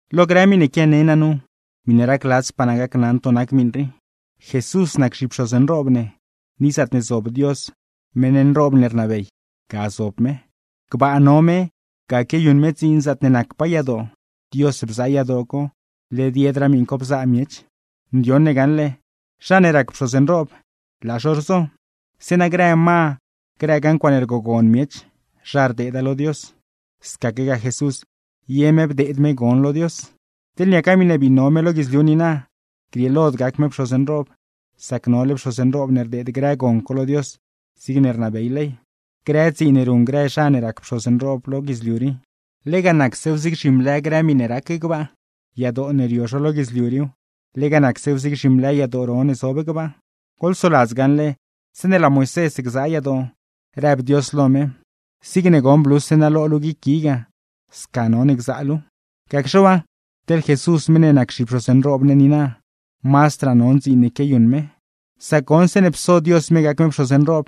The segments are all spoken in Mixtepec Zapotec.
Lo grë miṉe quiane naa nu, miṉe racladzpaa naa gacnaṉ to nac miṉ rii: Jesús nac zhipxoz nroob ne, ni zaatne zob Dios, meṉ nroob ne rnabey, ga zob me. Gbaa no me, ga quiayuṉ me dziin zaatne nacpaa yadoo, Dios bzaa yadoo co, led yedraa miṉ co bzaa miech. Ndioṉ ne gaṉle, zha ne rac pxoz nroob, laa zho rzo, zeeṉa grë ma, grëgaa ncuaaṉe rgogon miech, zha rdeeda lo Dios; scaquegaa Jesús, ye me bdeed me gon lo Dios. Teḻ niaca miṉe bii no me lo guidzliu niina, grieelod gac me pxoz nroob, sacne nole pxoz nroob ne rdeed grë gon co lo Dios, zigne rnabey ley. Grë dziin ne ruṉ grë zha ne rac pxoz nroob lo guidzliu rii, lega nacsew zig zhimlë grë miṉe rac gbaa; yadoo ne rio zho lo guidzliu riiw, lega nacsew zig zhimlë yadoo ro ne zob gbaa. Goḻsoladz gaṉle, zeeṉe laa Moisés gzaa yadoo, rëb Dios lo me: “Zigne goṉ bluse naa lo luu guic gui ga, sca none gzaa luuw.” Gacxe waa, teḻ Jesús meṉ ne nac zhipxoz nroob ne niina, mazdraa non dziin ne quiayuṉ me; sac goṉ, zeeṉe pso Dios me gac me pxoz nroob,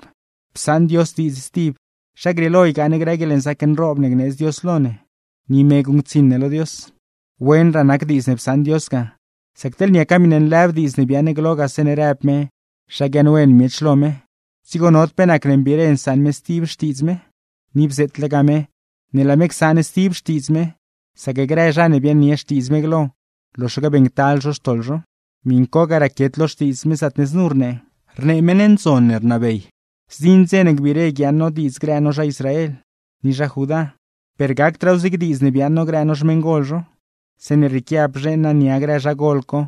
psaṉ Dios diidz stib zha grieelo ygaa ne grë guieḻnzaac nroob ne gneedz Dios lo ne, ni me guṉctsiṉ ne lo Dios. Wenraa nac diidz ne psaṉ Dios ga, sac teḻne niaca nlëb diidz ne biaaṉ glo ga zeeṉe rëb me zha guiaaṉwen miech lo me, dzigo nod pe nacne mbiire nsaṉ me stib xtiidz me. Ni bzeetlegaa me ne laa me csaṉ stib xtiidz me, sac grë zha ne biaaṉnie xtiidz me glo, loxaque beeṉctal zho xtoḻ zho. Miṉ co ga raquiet lo Xtiidz me, zaatne znu rnee: Rnee meṉ ndzon ne rnabey: Zdziṉ dze ne gbiire guiaaṉ no diidz grë no zha Israel, ni zha Judá. Per gacdraaw zig diidz ne biaaṉ no grë no xmeṉgol zho, zeeṉe rrieequia bzheeṉ naa nia grë zha gol co,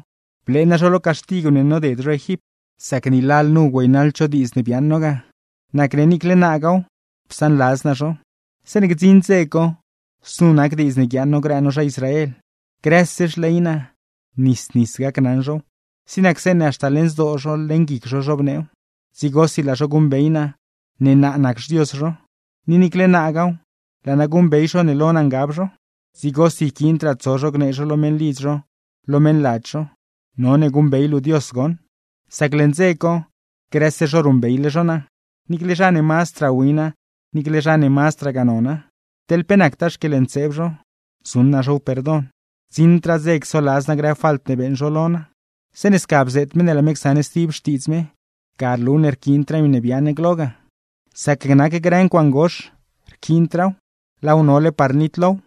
blee naa zho lo caxtigw ne noded zho Egipt; sac ni lalnu güeynaḻd zho diidz ne biaaṉ no ga, nacne niicle naagaaw, psaanladz naa zho. Zeeṉe gdziṉ dze co, znu nac diidz ne guiaaṉ no grë no zha Israel: Grëse xley naa, nis nis gacnaṉ zhow, zig nac zeeṉe haxta leṉ zdoo zho, leṉ guic zho zhobneew. Dzigosi laa zho guṉbey naa ne naa nac xDios zho, ni niicle naagaaw, laa naa guṉbey zho ne lo naa ngab zho. Dzigosi yquiindraa tso zho gnee zho lo meṉlidz zho, lo meṉladz zho: “None guṉbey luu Dios goṉ.” Sac leṉ dze co, grëse zho ruṉbeyle zho naa, niicle zha ne mazdraa wina, niicle zha ne mazdragaa nona. Teḻ pe nactaa xquieḻntseeb zho, zuṉ naa zhow perdon; gdziṉdraa dze csoladz naa grë falt ne beeṉ zho lo naa. Zeeṉe sca bzeet me ne laa me csaṉ stib xtiidz me, ga rlu ne rquiindraa miṉe biaaṉ glo ga; sac nac grë ncuaaṉ gox rquiindraaw, laaw nole par nitlow.